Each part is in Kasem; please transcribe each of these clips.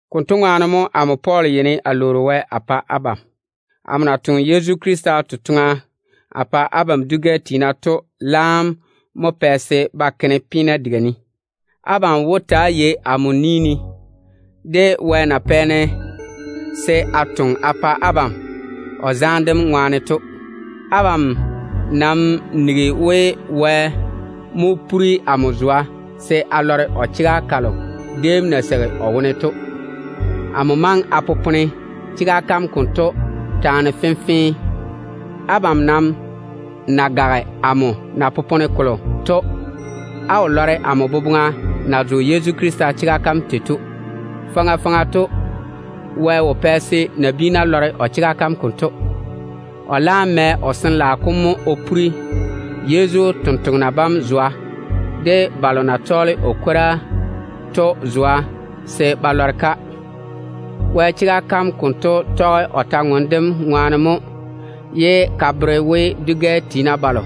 Konto ŋwaane mo amo Pɔɔl yeini a lwoori Wɛ a pa abam. Amo na toŋe Yezu Krista totoŋa a pa abam dwi-gɛ tiina to laam mo pɛ se ba ke-ne peena diga ne. Abam wó ta‑á yei amo ni ne, de Wɛ na pɛ se a toŋe a pa abam o zaane dem ŋwaane to. Abam nam nigi we, Wɛ mo le chega kalo déem na seigi o wone to o bere-ne. Amo maŋe a popone chega kam konto taane fenfee. Abam nam ná gaga amo na popone kolo to, á wó lɔre amo boboŋa na zo Yezu Krista chega kam tei to. Faŋa faŋa to, Wɛ wo pɛ se nabiina lɔre o chega kam konto. O laam tɔge o Sin-laao kom baŋa mo o le-ka o bere Yezu totoŋa nakwa bam de o ni-jwoŋina bam. Wɛ chega kam konto tɔge o kwor-ywoŋa kam ŋwaane mo, ye ka bere we, dwi-gɛ tiina balo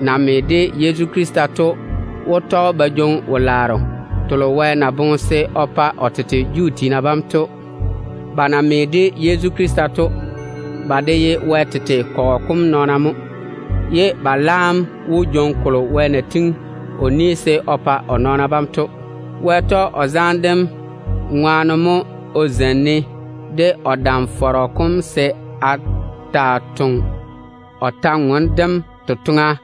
na me de Yezu Krista to wó tɔge de Juu tiina ba jwoŋi wo-laaro telo Wɛ na tiŋi se o pa o nɔɔna bam to. Ba na me de Yezu Krista to, ba de ye Wɛ tete kɔgɔ kom nɔɔna mo, ye ba laam wó jwoŋi kolo maama Wɛ na pwooli se o pa o nɔɔna bam to. Wɛ tɔge o zaane dem ŋwaane mo o zeini-ne de o dam-fɔrɔ kom se a taa toŋe o kwor-ywoŋa kam totoŋa.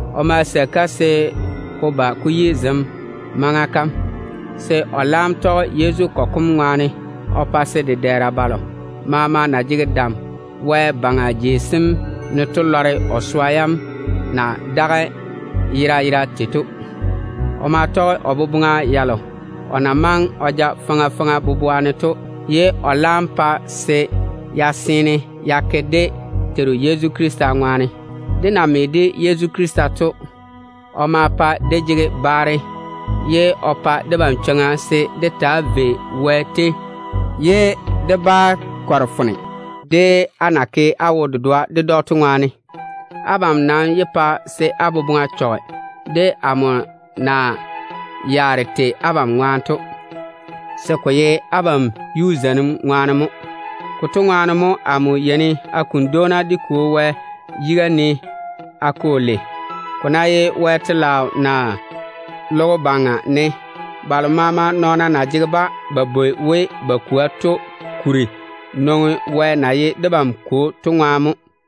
O ma seigi-ka se ko ba ko yi zem maŋa kam, se o laam tɔge Yezu kɔgɔ kom ŋwaane o pa se dedɛɛra balo maama na jege dam wɛ-baŋa jei sem ne to lɔre o swa yam na daga yera yera tei to. O maa tɔge o boboŋa yalo o na maŋe o ja faŋa faŋa to, ye o laam pa se ya seene ya ke dé Teiru Yezu Krista ŋwaane. Dé na me de Yezu Krista to, o maa pae dé jege baare. O ta ma pa debam chwoŋa se dé taa vei Wɛ tei ye dé ba kɔre foone, dé na ke dé wo-dedoa ded‑o to ŋwaane. Abam nam yé pa se á boboŋa chɔge de amo na yaare tei abam ŋwaane to, se ko ye abam yuu zeiŋim ŋwaane mo. Konto ŋwaane mo amo yeini a kuni dwoona dé Kwo Wɛ yiga ne. Ko ná ye Wɛ telaao ne, naa logo baŋa ne, balo maama nɔɔna na jege-ba ba bwoi we ba kwoa to kuri nwoŋi dé Kwo Wɛ wone mo.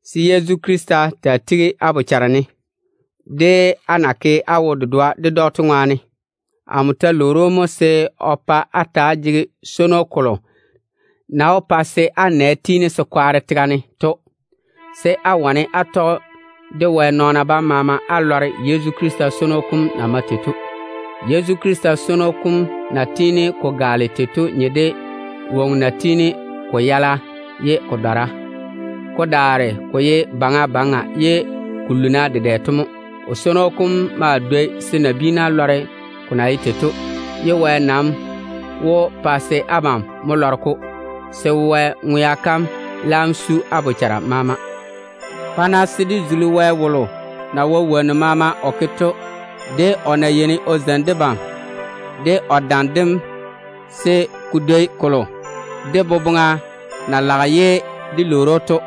se Yezu Krista taa tigi á boboŋa ne, de á na ke á wo-dedoa ded‑o to ŋwaane. Amo ta lwoori‑o mo se o pa á ta‑á jege swono kolo na wó pa á nɛ tiini se kwaare tega ne to, se á wane á tɔge de Wɛ nɔɔna bam maama á lɔre Yezu Krista swono kom na mae tei to. Yezu Krista swono kom na tiini ko gaale tei to nye de woŋo na tiini ko yala ye ko dɔra, ko daare ko ye baŋa baŋa ye ko luuna dedɛ to mo. O swono kom maa dwoi se nabiina lɔre ko na ye tei to ba ti. Wɛ nam wó pa se abam lɔre-ko, se Wɛ ŋwea kam laam su á bochara maama. Pa-na se dé zuli Wɛ wom na wae wonnu maama o ke to, de o na yeini o zeini debam de o dam dem se ko tiini ko dwoni kolo dé boboŋa na laga ye dé lwoori‑o to.